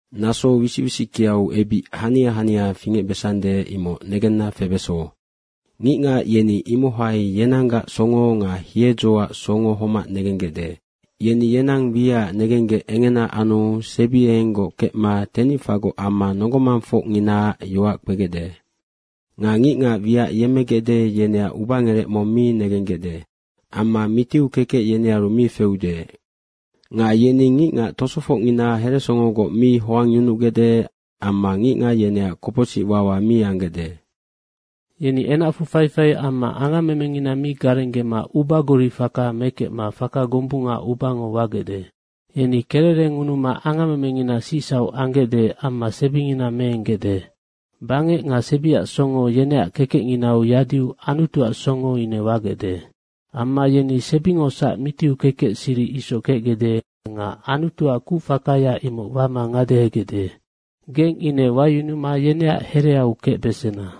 Naso wisic wisickeau ebic hania hania fingecbesande, imoc negenna febeso. Ngicngac yeni imohai yenanggac songo nga hiedzoac songo homac negenggecde. Yeni yenang wiacac negenggec engena anu sebiengenggoc kecma tenicfagoc amma nonggo mangfocnginaac yoac kpegecde. Nga ngicngac wiac yemmegecde, yeneac ubangerec mong mi negenggecde. Amma mitiu kekec yenearu mi feude. Nga yeni ngicngac tosofocngina heresongogoc mi hoangyunugecde amma ngicngac yeneac kopocsic wawa mi anggecde. Yeni enacfu faifai amma angammemengina mi garenggema ubagori faka mekecma faka gombunga ubango wagecde. Yeni kererengunuma angammemengina sicsauc anggecde amma sebingina meenggecde. Bangec nga sebiac songo yeneac kekecnginau yadiu Anutuac songo ine wagecde. Amma yeni sebingosac mitiu kekec siric isoc kecgecde nga Anutuac kucfakaya imoc wama ngadehegecde. Nga geng ine wayunuma yeneac hereau kecbesena.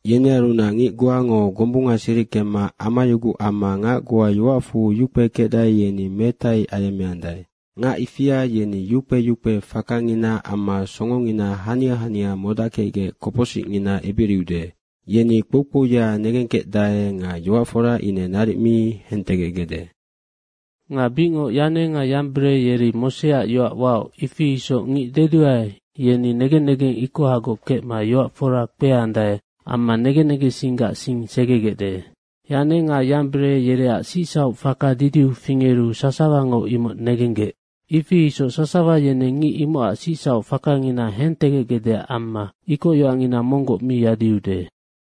Yenearunac ngic goango gombunga siric kemma amayuguc amma ngac goa yoacfu yukpe kecdae, yeni metai ayemmeandae. Ngac ifia yeni yukpe yukpe fakangina amma songongina hania hania modackecgec kopocsicngina ebiriude. Yeni kpoukpouya negengkecdae nga yoac fora ine naric mi hentegecgecde. Nga bicngoc Yane nga Yambere yeri Moseac yoac waoc, ifi isoc ngic deduae, yeni negen negeng ikohagoc kecma yoac fora kpeandae amma negen negensinggac sing segegecde. Yane nga Yambere yereac sicsauc faka didiu fingeru sasawango imoc negenggec, ifi isoc sasawa yeneng ngic imocac sicsauc fakangina hentegecgecdeac amma ikoc yoacngina monggoc mi yadiude.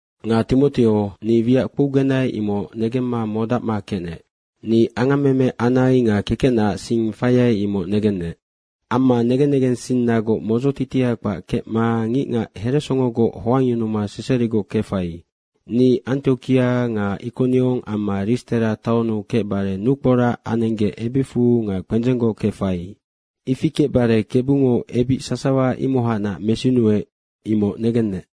Nga Timoteo, ni wiac kpougenai, imoc negemma modacma kecnec. Ni angammeme anai nga kekecnaac sing faiai, imoc negennec. Amma negen negensinnagoc modzotitia kpac kecma ngicngac heresongogoc hoangyunuma seserigoc kefai. Ni Antiokia nga Ikoniong amma Ristera taonnu kecbare nukporac anenggec ebicfu nga kpendzenggoc kefai. Ifi kecbare Kebungo ebic sasawa imohacnac mesinuec, imoc negennec.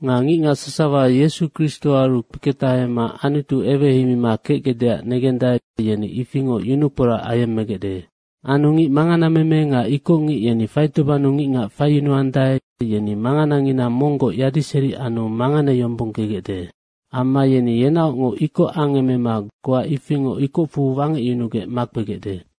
Nga ngicngac sasawa Yesu Kristoaru kpeketahama Anutu eweheimima kecgecdeac negendae, yeni ifingoc yunukporac ayemmegecde. Anu ngic manganameme nga ikocngic yeni faitobannu ngicngac faiyunuandae, yeni manganangina monggoc yadiseri anu manganeyombonggegecde. Amma yeni yenaocngoc ikoc angemema goa ifingoc ikocfu wangecyunugec makpegecde.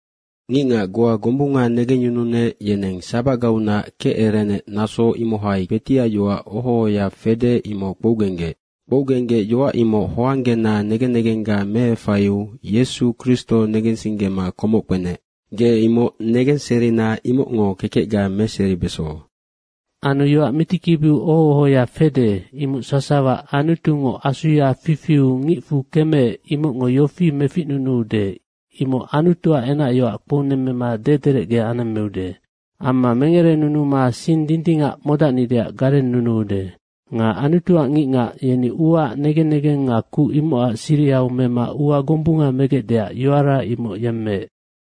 Ngicngac goa gombunga negengyununec, yeneng sabacgaunac kecerenec, naso imohai kpetiac yoac oho ohoya fede, imoc kpougenggec. Kpougenggec yoac imoc hoanggena negen negengga meefaiu Yesu Kristo negensinggema komoc kpenec. Ge imoc negenserina imocngo kekecga meseribeso. Anu yoac mitikibiu oho ohoya fede, imoc sasawa Anutungo asuya fifiu ngicfu kemeec, imocngo yofi meficnunuude, imoc Anutuac enacyoac kpounemmema dederecge anemmeude. Amma mengerenunuma sing dindingac modacnideac garennunuude. Nga Anutuac ngicngac yeni uaac negen negeng nga kuc imocac sirihau mema ua gombunga megecdeac yoara imoc yemmeec.